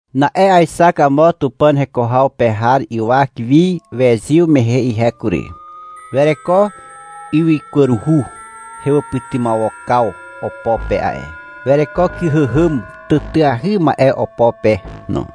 Na'e aexak amo Tupàn heko haw pe har ywak wi wezyw mehe ihe kury. Wereko ywykwaruhu hewàpytymawokaw opo pe a'e. Wereko kyhàhàm tàtàahy ma'e opo pe no.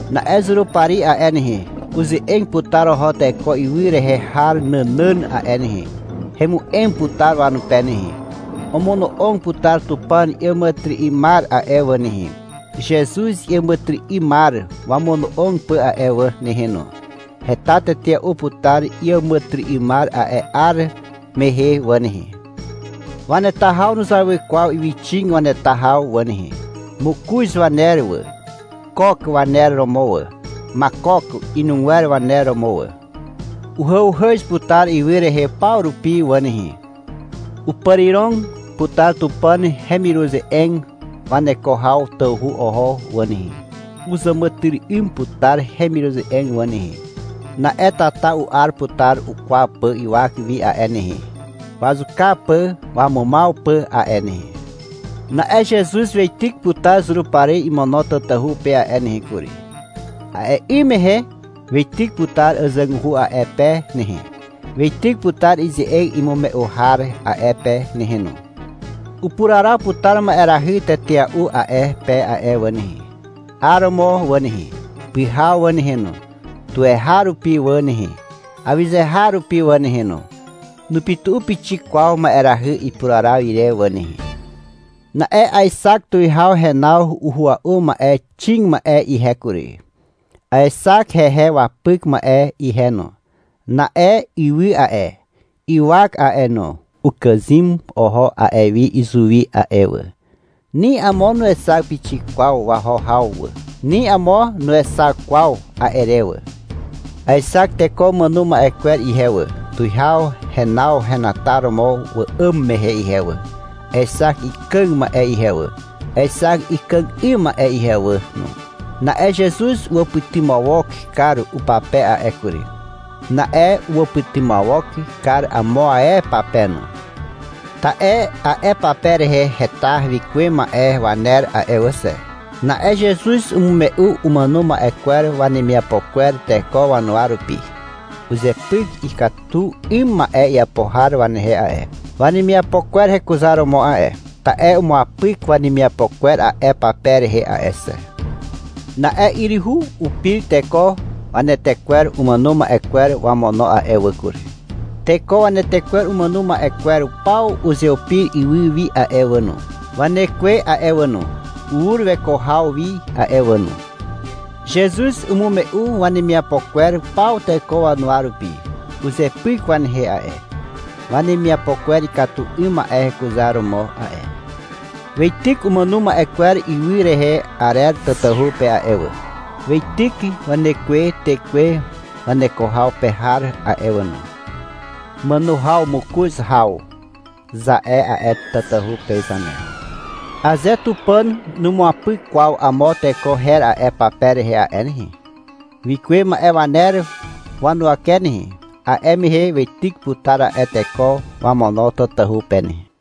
Na'e Zurupari a'e nehe, uze'eg putar oho teko ywy rehe har nànàn a'e nehe. Hemu'em putar wanupe nehe. Omono'og putar Tupàn iàmàtyry'ymar a'e wà nehe, Zezuz iàmàtyry'ymar wamono'og pà a'e wà nehe no. Heta tetea'u putar iàmàtyry'ymar a'e 'ar mehe wà nehe. Waneta haw nuzawy kwaw ywyxig waneta haw wà nehe. (Mokoz waner wà. Kok, waner romo wà. Makok inugwer waner romo wà.) Uhàuhàz putar ywy rehe paw rupi wà nehe. Upàrirog putar Tupàn hemiruze'eg waneko haw tawhu oho wà nehe. Uzàmàtyry'ym putar hemiruze'eg wà nehe. Na'e tata u'ar putar ukwaw pà ywak wi a'e nehe, wazuka pà wamumaw pà a'e nehe. Na'e Zezuz weityk putar Zurupari imono tatahu pe a'e nehe kury. A'e 'ym mehe weityk putar àzàguhu a'e pe nehe. Weityk putar ize'eg imume'u har a'e pe nehe no. Upuraraw putar ma'erahy tetea'u a'e pe a'e wà nehe, 'aromo wà nehe, pyhaw wà nehe no. Tuweharupi wà nehe, awyze har rupi wà nehe no. Nupytu'u pixik kwaw ma'erahy ipuraraw ire wà nehe. Na'e aexak tuwihaw henaw uhua'u ma'e xig ma'e ihe kury. Aexak hehe wapyk ma'e ihe no. Na'e ywy a'e, ywak a'e no, ukàzym oho a'e wi izuwi a'e wà. Ni amo nuexak pixik kwaw waho haw wà. Ni amo nuexak kwaw a'e re wà. Aexak teko umàno ma'e kwer ihe wà, tuwihaw henaw henataromo wa'àm mehe ihe wà. Aexak ikàg ma'e ihe wà. Aexak ikàg 'ym ma'e ihe wà no. Na'e Zezuz uwàpytymawok kar upape a'e kury. Na'e uwàpytymawok kar amo ae pape no. Ta'e a'e pape rehe heta wikuwe ma'e waner a'e wà xe. Na'e Zezuz umume'u umàno ma'e kwer wanemiapo kwer teko wanuwa rupi. Uzepyk ikatu 'ym ma'e iapo har wanehe a'e, wanemiapo kwer hekuzaromo a'e. Ta'e umuapyk wanemiapo kwer a'e pape rehe a'e xe. Na'e yryhu upir teko wanetekwer umàno ma'e kwer wamono a'e wà kury. Teko wanetekwer umàno ma'e kwer paw uzeupir ywy wi a'e wà no. Wanekwe a'e wà no, ur weko haw wi a'e wà no. Zezuz umume'u wanemiapo kwer paw teko wanuwa rupi. Uzepyk wanehe a'e, wanemiapo kwer ikatu 'ym ma'e hekuzaromo a'e. Weityk umàno ma'e kwer ywy rehe arer tatahu pe a'e wà. Weityk wanekwe tekwe waneko haw pe har a'e wà no. Màno haw mokoz haw, za'e a'e tatahu pe zane. Aze Tupàn numuapyk kwaw amo teko her a'e pape rehe a'e nehe, wikuwe ma'e waner wanuwake nehe, a'e mehe weityk putar a'e teko wamono tatahu pe nehe.